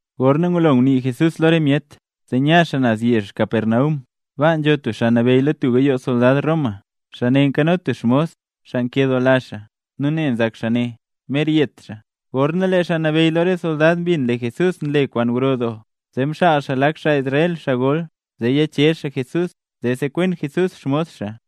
Gorna ngulo ngunii Jesús lo re myet, zee nya xaa naz yezh Capernaum. Baa nzho tub xaa nabeyy lo tub gayoo soldad Roma, xaa ne nkano tub xmos, xaa nkedoola xaa, nu ne nzak xaa ne, mer yet xaa. Gorna lee xaa nabeyy lo re soldad mbin lee Jesús nle kwaan gro doo, zee mxaal xaa lak xaa Israel, xaa gol, zee yichezh xaa Jesús zee sekwen Jesús xmos xaa.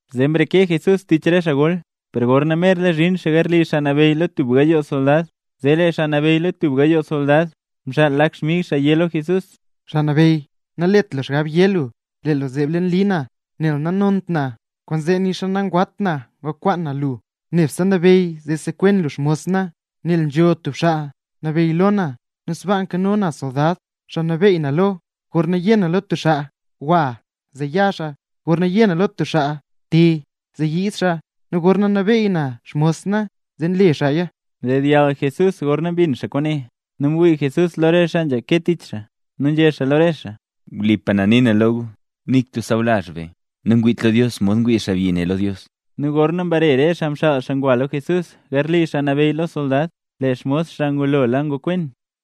Zee mreke Jesús tich re xaa gol, per gorna merla zhin xaa garli xaa nabeyy lo tub gayoo soldad, zee lee xaa nabeyy lo tub gayoo soldad mxaal lak xmig xaa yé xaa lo Jesús: —Xaa Nabeyy, nalet lu xgab yé lu lee lu zeeb leen li na, nel nanont na lo lu, kwaanzee nixa nangwat na ngukwaan na lu. Nebse nabeyy zee sekwen lu xmos na. Nel nzho tub xaa nabeyy lo na, nu sbaaka nkano na soldad, xaa nabeey na lo. Gorna yé na lo tub xaa: “Gwa”, zee ya xaa; gorna yé na lo stub xaa: “Te”, zee nyiid xaa lo na; nu gorna nabeey na xmos na le xaa tub kwaan, zee nle xaaya. Mdedyall Jesús gorna mbin xaa kwaane, nu mwii Jesús lo re xaa nzhake tich xaa nu nzhé xaa lo re xaa: —Wlipa na nii na lo gu, ¡nik tub xaa sawlazh be nangwiit lo Dios modxa ngwii xaabyi ne lo Dios! Nu gorna mbare re xaa mxaal xaa ngwa lo Jesús garli xaa nabeyy lo soldad, lee xmos xaa ngulola ngokwen.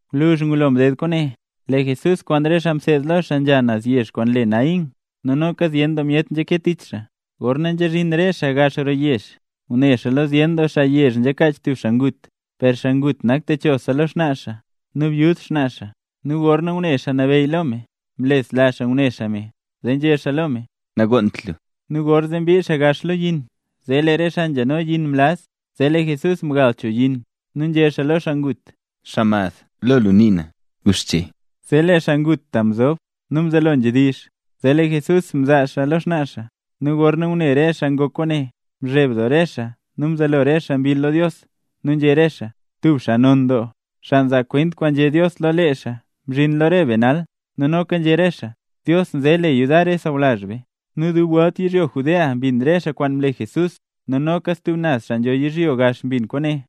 Gwluzh ngulo mded kwaane, lee Jesús kwaan re xaa mseed lo xaa nzha naz yezh kwaan le Naín. Nu noka zyen doo myet nzhake tich xaa. Gorna nzhazhin re xaa gax roo yezh, ngune xaa lo zyen doo xaa yezh nzhakaach tub xaa ngut. Per xaa ngut nak techosa xaa lo xnaa xaa, nu byud xnaa xaa. Nu gorna ngune Xaa Nabeyy lo me, mlesla xaa ngune xaa me, zee nzhé xaa lo me: —Nagonnt lu. Nu gorzee mbii gax xaa lo yin, zee lee re xaa nzhano yin mlaz, zee lee Jesús mgal cho yin nu nzhé xaa lo xaa ngut: —Xaa mad, ¡guxche! Zee lee xaa ngut ta mzob nu mzelo nzhedizh, zee lee Jesús mzaa xaa lo xnaa xaa. Nu gorna ngune re xaa ngok kwaane, mzheb doo re xaa nu mzelo re xaa mbill lo Dios, nu nzhé re xaa: —Tub xaa non doo, xaa nzaa kwent kwaan nzhé Dios lo lee xaa mzhin lo re be nee nal. Nu noka nzhé re xaa: —Dios nze le yudar re sawlazh be. Nu dub welt yizhyo Judea mbin re xaa kwaan mle Jesús nu noka re stub naz xaa nzho yizhyo gax mbin kwaane.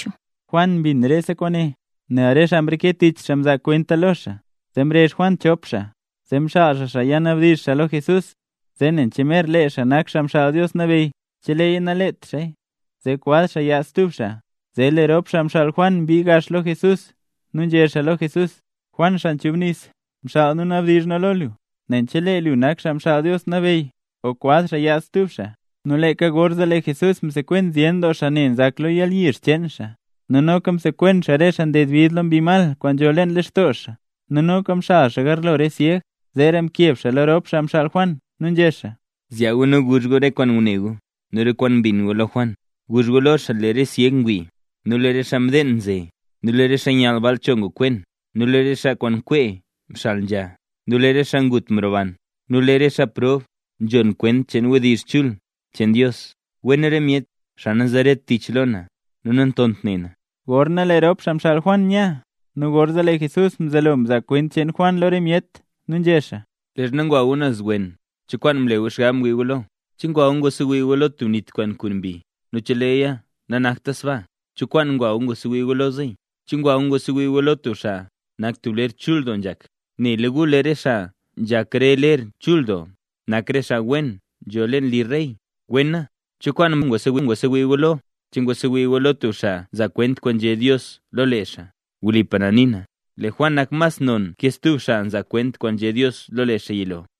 Juan mbin rese kwaane, nel re xaa mreke tich xaa mzaa kwenta lo xaa. Zee mrezh Juan chop xaa. Zee mxaal xaa xaa ya nabdizh xaa lo Jesús zee nen che mer lee xaa nak Xaa Mxaal Dios Nabeyy, cheleeya nalet xaaya, zee kwaz xaa yaad stub xaa. Zee lee rop xaa mxaal Juan mbii gax lo Jesús nu nzhé xaa lo Jesús: —Juan Xaa Nchubnis mxaal nu nabdizh nu lo lu, nen chelee lu nak Xaa Mxaal Dios Nabeyy o kwaz xaa yaad stub xaa. Nu leeka gorzee lee Jesús msekwen zyen doo xaa ne nzak lo yalyizh cheen xaa, nu noka msekwen xaa re xaa nded bid lo mbi mal kwaan nzho leen lextoo xaa, nu noka mxal xaa garlo re syeg. Zeera mkeb xaa lo rop xaa mxaal Juan, nu nzhé xaa: —Zyaa gu nu guzh gu re kwaan ngune gu nu re kwaan mbin gu lo Juan. Guzh gu lo xaa lee re syeg ngwii, nu lee re xaa mdeen nze, nu lee re xaa nyall cho ngokwen, nu lee re xaa nkwee mxal nzha, nu lee re xaa ngut mroban, nu lee lo re xaa prob nzhon kwent cheen wdizh chul cheen Dios. ¡Wen re myet, xaa nanzeret tich lo na nu nantont ne na! Gorna lee rop xaa mxaal Juan nya, nu gorzee lee Jesús mzelo mzaa kwent cheen Juan lo re myet, nu nzhé xaa: —Leezha ngwa gu naz wen, ¿cho kwaan mle gu xgab wii gu lo? ¿Che ngwa gu ngwasewii gu lo tub nit kwaan nkun mbi? Nu cheleeya nanakta sbaa, ¿cho kwaan ngwa gu ngwasewii gu lo zeey? ¿Che ngwa gu ngwasewii gu lo tub xaa nak tub ler chul doo nzhak? Nela gu lee re xaa nzhak re ler chul doo, nak re xaa wen nzho leen li re rey. Wena, ¿cho kwaan mroo gu ngwasewii gu lo? ¿Che ngwasewii gu lo tub xaa nzaa kwent kwaan nzhé Dios lo lee xaa? Wlipa na nii na, lee Juan nak mas non ke stub xaa mzaa kwent kwaan nzhé Dios lo lee xaa yilo.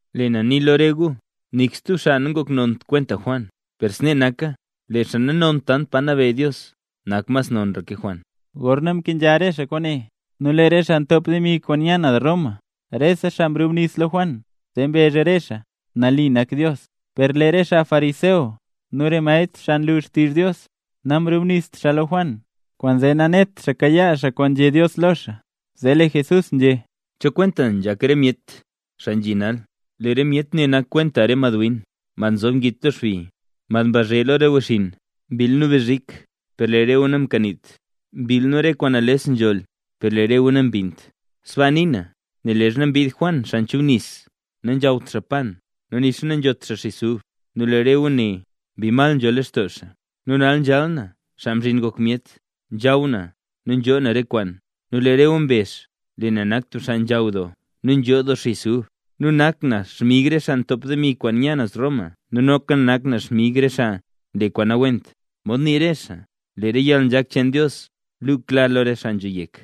’Lee na nii lo re gu, nik stub xaa nangoknont kwenta Juan. Per snee naka, lee xaa nanont tant pa nabeyy Dios, nak mas nonra ke Juan. Gorna mkenzha rese xaa kwaane, nu lee re xaa ntop demi kwaan nya naz Roma, rese xaa mrubnis lo Juan, zee mbezh re xaa: “Nali nak Dios”. Per lee re xaa fariseo nu re maestr xaa nlu xtizh Dios, namrubnist xaa lo Juan, kwaanzee nanet xaa kayaa xaa kwaan nzhé Dios lo xaa. Zee lee Jesús nzhé: —¿Cho kwenta nzhak re myet xaa nzhi nal? Lee re myet ne nak kwenta re madwin, mad nzob ngit lo xbi, mad mbazhe lo re wechxinn: “Mbill nu bzhik, per lee re gu namkaniit; mbill nu re kwaan nales nzholl, per lee re gu nambinnt”. Sbaa nii na, nel leezha mbid Juan Xaa Nchubnis, nanzhawt xaa pan, nu nixa nanzhot xaa xis ub, nu lee re gu né: “Mbi mal nzho lextoo xaa”. ’Nu nal nzhal na, Xaa Mzhin Ngok Myet, nzhaw na nu nzhoo na re kwaan, nu lee re gu mbezh lee na nak tub xaa nzhaw doo nu nzho doo xis ub, nu nak na xmig re xaa ntop demi kwaan nya naz Roma nu noka nak na xmig re xaa nle re kwaan nawent. Mod nii re xaa: “Lee yalnzhak cheen Dios luu klar lo re xaa nzho yek”.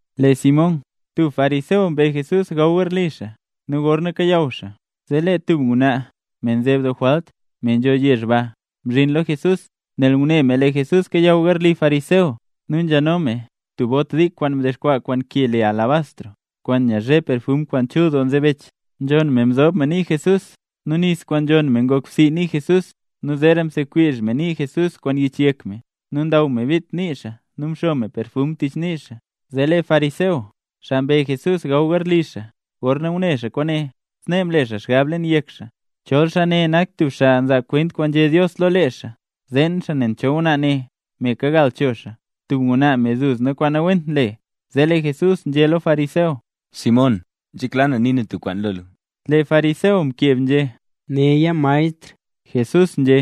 Lee Simón, tub fariseo mbe Jesús gaw garli xaa. Nu gorna kayaw xaa, zee lee tub ngwnaa, me nzeb doo jwalt, me nzho yezh ba, mzhin lo Jesús, nel ngune me lee Jesús kayaw garli fariseo. Nu nzheno me tub bot dik kwaan mdexkwaa kwaan ke le alabastro, kwaan nyazhe perfum kwaan chul doo nzebech. Nzhonn me mzob me nii Jesús, nu nis kwaan nzhonn me ngok bsii nii Jesús. Nu zeera msekwizh me nii Jesús kwaan yich yek me. Nu ndaw me bit nii xaa nu mxo me perfum tich nii xaa. Zee lee fariseo, xaa mbe Jesús gaw Jesús garli xaa, gorna ngune xaa kwaane, snee mle xaa xgab leen yek xaa: “Chol xaa ne ngak tub xaa nzaa kwent kwaan nzhé Dios lo lee xaa, zeen xaa nen cho ngwnaa ne, me kagal cho xaa, tub ngwnaa me duzna kwaan nawent nle”. Zee lee Jesús nzhé lo fariseo: —Simón, nzhekla na nii na tub kwaan lo lu. Lee fariseo mkeb nzhé: —Néya maestr. Jesús nzhé: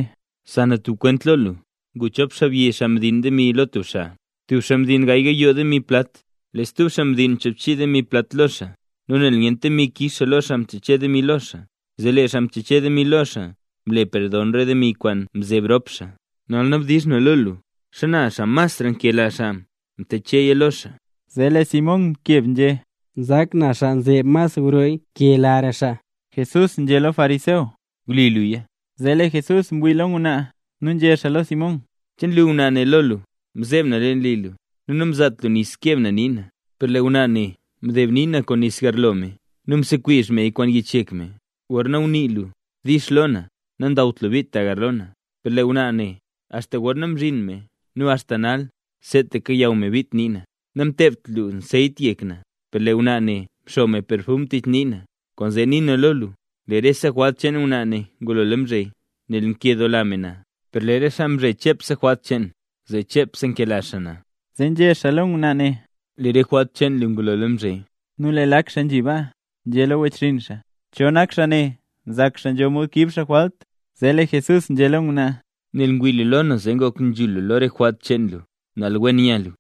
—Za na tub kwent lo lu. Ngu chop xaabyi xaa mdiin demi lo tub xaa. Tub xaa mdiin gaay gayoo demi plat, lee stub xaa mdiin choobchii demi plat lo xaa. Nu nel nyent demi kix xaa lo xaa mteche demi lo xaa, zee lee xaa mteche demi lo xaa mle perdon re demi kwaan mzeb rop xaa. Nal nabdizh na lo lu: ¿xana xaa mas mkelara xaa mtecheya lo xaa? Zee lee Simón mkeb nzhé: —Nzak na xaa nzeb mas grorey nkelara xaa. Jesús nzhé lo fariseo: —Wli luya. Zee lee Jesús mwii lo ngwnaa nu nzhé xaa lo Simón: —¿Che nlu ngwnaa ne lo lu? Mzeeb na leen li lu, nu namzaat lu nis keeb na nii na; per lee ngwnaa ne mdeeb nii na kwaan nis garlo me nu msekwizh meya kwaan yich yek me. Gorna ngunii lu “dix” lo na, nandawt lu bit tagarlo na. Per lee ngwnaa ne, axta gorna mzhin me, nu axta nal seetaka kayaw me bit nii na. Namteebt lu anseyt yek na, per lee ngwnaa ne mxo me perfum tich nii na. Kwaanzee nii na lo lu, lee rese jwalt cheen ngwnaa ne ngulola mzhe, nel nkedoola me na. Per lee re xaa mzhe chepse jwalt cheen, zee chepse nkela xaa na. Zee nzhé xaa lo ngwnaa ne: —Lee re jwalt cheen lu ngulola mzhe. Nu lee lak xaa nzhi baa, nzhé lo wechxinn xaa: —¿Cho nak xaa ne, nzak xaa nzho mod kiib xaa jwalt? Zee lee Jesús nzhé lo ngwnaa: —Nel ngwii lu lo na zee ngok nzhul lu lo rese jwalt cheen lu, nal wen nya lu.